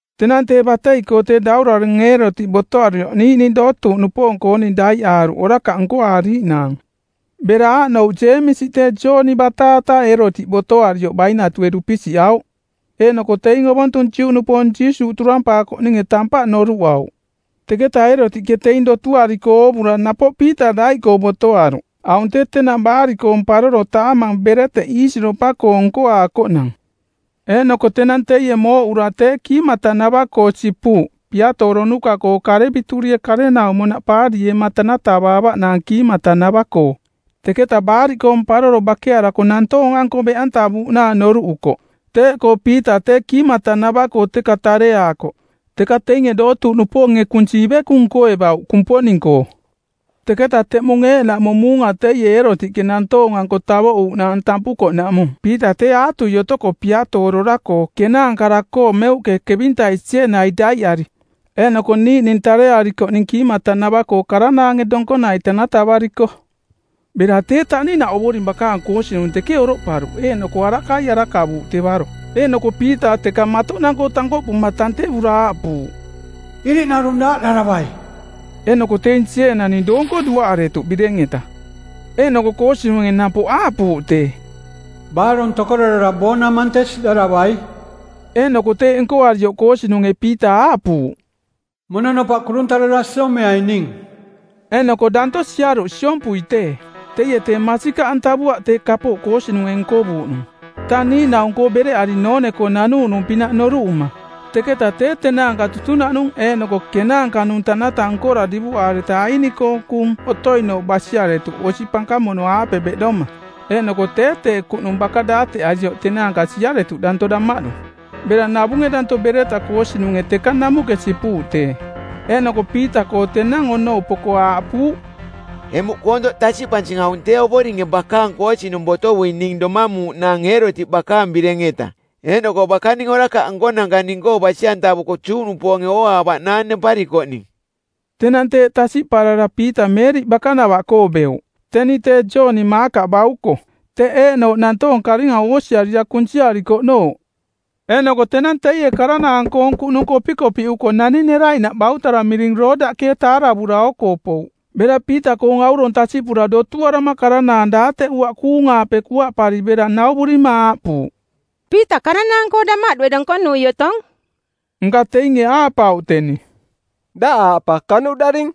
Tenang tee batei-koo tee daurarong˜ Eerotiꞌ botoarioꞌ niiꞌning dootuuꞌnupoong-kooning daiꞌaaruꞌ orakaꞌ nkoaariiꞌnaang. Bera aaꞌnouꞌ Jeemisi tee Jooni bataata, Eerotiꞌ botoarioꞌ bainatue dupisiꞌauꞌ. Eeꞌnoko teing ovontung Juꞌnupoong Jiisuuꞌ turampaakoꞌninge tampaꞌ noruꞌauꞌ; Teketa Eerotiꞌke teing dotuariko oovura napoꞌ Piita daiꞌkoo botoaruꞌ. Aung tee tenang Baariꞌkoong˜ Paroro, taamang bereteꞌ iisiropa-koong nkoaakoꞌnang. Eeꞌnoko tenang teie mooꞌura tee kiimatanava-koo sipuuꞌ piatooronuka-koo kareviturie karenaumonaꞌ paarieema tanatavaavaꞌnaang kiimatanava-koo. Teketa Baariꞌkoong Paroro bakearako nantoong-anko beꞌantavuuꞌnaang noruꞌukoꞌ. Teeꞌkoo Piita tee kiimatanava-koo teka tareaakoꞌ, teka teinge dootuuꞌnupoonge kunsi ivekung nkoevauꞌ Kumponing-koo. Teketa teꞌmung eeꞌnaꞌmung muunga teie Eerotiꞌke nantoong-anko tavoꞌuuꞌnaang tampukoꞌnaꞌmung Piita tee aatui otoko piatoorora-koo˜ kenaankara-koo meuꞌke kevintai sieenai daiꞌari. Eeꞌnoko niiꞌning tarearikoꞌning kiimatanava-koo karanaange donkonai tanatavariko. Bera tee taꞌninaꞌ Ovoring bakaang koosinung teke oroꞌparuꞌ eeꞌnoko arakai arakavuuꞌ tevaro. Eeꞌnoko Piita teka matoꞌnang-koo tankoꞌpuma tantevura aaꞌpuuꞌ, “Iriꞌnarung daaꞌdaravai.” Eeꞌnoko teing sieenaning doonko duaꞌaretuꞌ bireng-eta. Eeꞌnoko koosinunge napoꞌ aaꞌpuuꞌ tee, “Baarong tokorarara boonamante˜ siꞌdaravai.” Eeꞌnoko teeꞌ nkoarioꞌ koosinunge Piita aaꞌpuuꞌ, “Mononopaꞌ kuruntarara siomeai ning.” Eeꞌnoko danto siaruꞌ siompui tee. Teie tee masikaꞌantavuaꞌ tee kapooꞌ koosinunge nkovuuꞌnung, tang niiꞌnaung-koo bereꞌari noone-koo nanuuꞌnung-pinaꞌ noruꞌuma. Teketa tee tenaanka tutunaꞌnung eeꞌnoko kenaanka-nung tanata nkora divuꞌaareta aini-koong kuꞌnung otoinooꞌ basiaretuꞌ osi pankamono-aape beꞌdoma. Eeꞌnoko tee tee kuꞌnung baka daateꞌarioꞌ tenaanka siaretuꞌ danto damaꞌdu. Bera navunge danto bereta koosinunge teka namuꞌke sipuuꞌ tee. Eeꞌnoko Piita-koo tenang onou poko aaꞌpuuꞌ, “Emuꞌ koontoꞌ tasiꞌpansing aung tee Ovoringe bakaang koosinung botovuing ning domamuuꞌnaang Eerotiꞌ bakaang bireng-eta eeꞌnoko bakaning orakaꞌ nkonanka ning-koo basi-antavuko Juꞌnupoonge ooaavaꞌnaang nemparikoꞌning.” Tenang tee tasiꞌparara Piita Meeriꞌ bakanava-koo beuꞌ, teni tee Jooni Maakaꞌ bauko, teꞌ eeꞌnooꞌ nantoong karinga oosiarira kunsiarikoꞌnooꞌ. Eeꞌnoko tenang teie karanaang-koong kuꞌnung kopikopiꞌuko nani neraiꞌnaꞌ bautara miring Roodaꞌke taaravura oo-koo pouꞌ. Bera Piita-koong aurong tasiꞌpura dotuarama karanaang daateꞌuaꞌ kuung-aape kuaꞌpari bera nauvurima aaꞌpuuꞌ, “Piita karanaang-koo damaꞌdue donkonui otong.” Nka teinge aaꞌpauꞌ teni, “Daꞌ aaꞌ pa kanuꞌdaring.”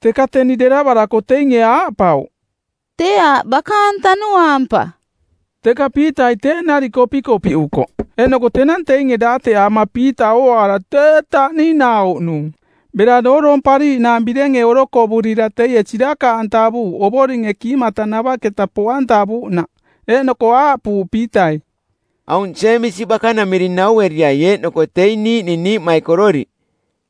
Teka teni deravarako teinge aaꞌpauꞌ, “Tee aaꞌ bakaang tanuaang pa.” Teka Piitai teeꞌ nariꞌ kopikopiꞌukoꞌ. Eeꞌnoko tenang teinge daateꞌaama Piita ooaara tee taꞌninauꞌnung. Bera dooroompariiꞌnaang birenge orokovurira teie sirakaꞌantavuuꞌ Ovoringe kiimatanavaꞌketa poꞌantavuuꞌnaꞌ. Eeꞌnoko aaꞌpuuꞌ Piitai, “Aung Jeemisi bakanamiring naueriai eeꞌnoko teing niiꞌning niiꞌmaikororiꞌ.”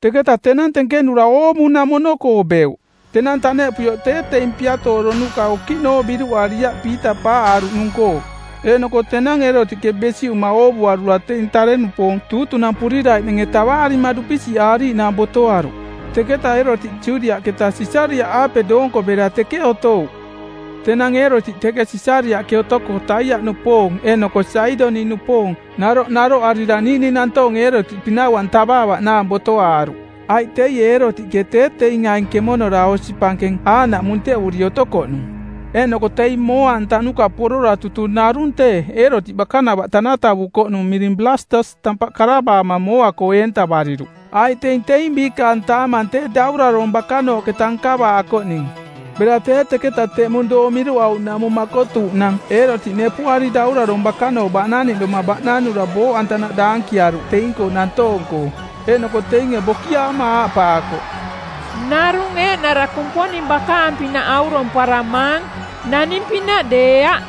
Teketa tenang tenkenura oovunamono-koo beuꞌ. Tenang taneꞌpuioꞌ tee teing piatooronuka okiꞌnooꞌ biruꞌariaꞌ Piita paaꞌaruꞌnung-koo. Eeꞌnoko tenang Eerotiꞌke besiꞌuma oovuarura teing tare-nupoong tuutunampuriraiꞌnange tavaarima dupisiꞌaariiꞌnaang botoaruꞌ. Teketa Eerotiꞌ Judiaꞌketa Sisariaꞌaape doonko bera teke otouꞌ. Tenang Eerotiꞌ teke Sisariaꞌke otoko Taiaꞌnupoong eeꞌnoko Saidoniꞌnupoong naroꞌ naroꞌarira niiꞌning nantoong Eerotiꞌ pinau-antavaavaꞌnaang botoaaruꞌ, aiꞌ teie Eerotiꞌke tee teing aing kemonora osi pankeng aaꞌnaꞌ munteꞌuri otokoꞌnung. Eeꞌnoko teing mooa-antanuka porora tutung narung tee Eerotiꞌ bakanava tanatavukoꞌnung miring Blastus tampaꞌ karavaama mooa-koo eentavariruꞌ, aiꞌ teing teing biikaang taamang tee daurarong bakanooꞌketa nkavaakoꞌning. Bera tee teketa teꞌmung doong miruꞌuuꞌnaꞌmung makotuuꞌnang Eerotiꞌ nepuꞌari daurarong bakanooꞌ baꞌnaniꞌdoma baꞌnanura booꞌantanaꞌ daankiaruꞌ teing-koo nantoong-koo. Eeꞌnoko teinge bokiaama aaꞌpaakoꞌ, “Narung eeꞌnara kumponing bakaang-pinaꞌ auromparamaang, naning-pinaꞌ deeaꞌ.”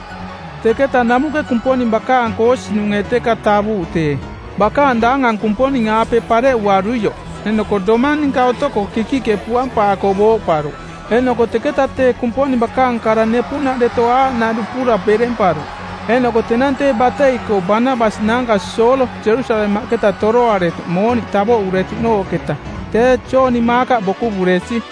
Teketa namuꞌke Kumponing bakaang koosinunge˜ teka tavuuꞌ tee, bakaang daangang Kumponing-aape pareꞌuaruioꞌ. Eeꞌnoko domang ninka otoko kikiꞌke puampaako booꞌparuꞌ. Eeꞌnoko teketa tee Kumponing bakaang kara nepuꞌnaꞌ deto aaꞌnaꞌ dupura beremparuꞌ. Eeꞌnoko tenang tee batei-koo Banabas naanka Soolo Jerusalemaꞌketa toroaretuꞌ mooniꞌ tavoꞌuretuꞌnooꞌketa, tee Jooni Maakaꞌ bokuvuresi.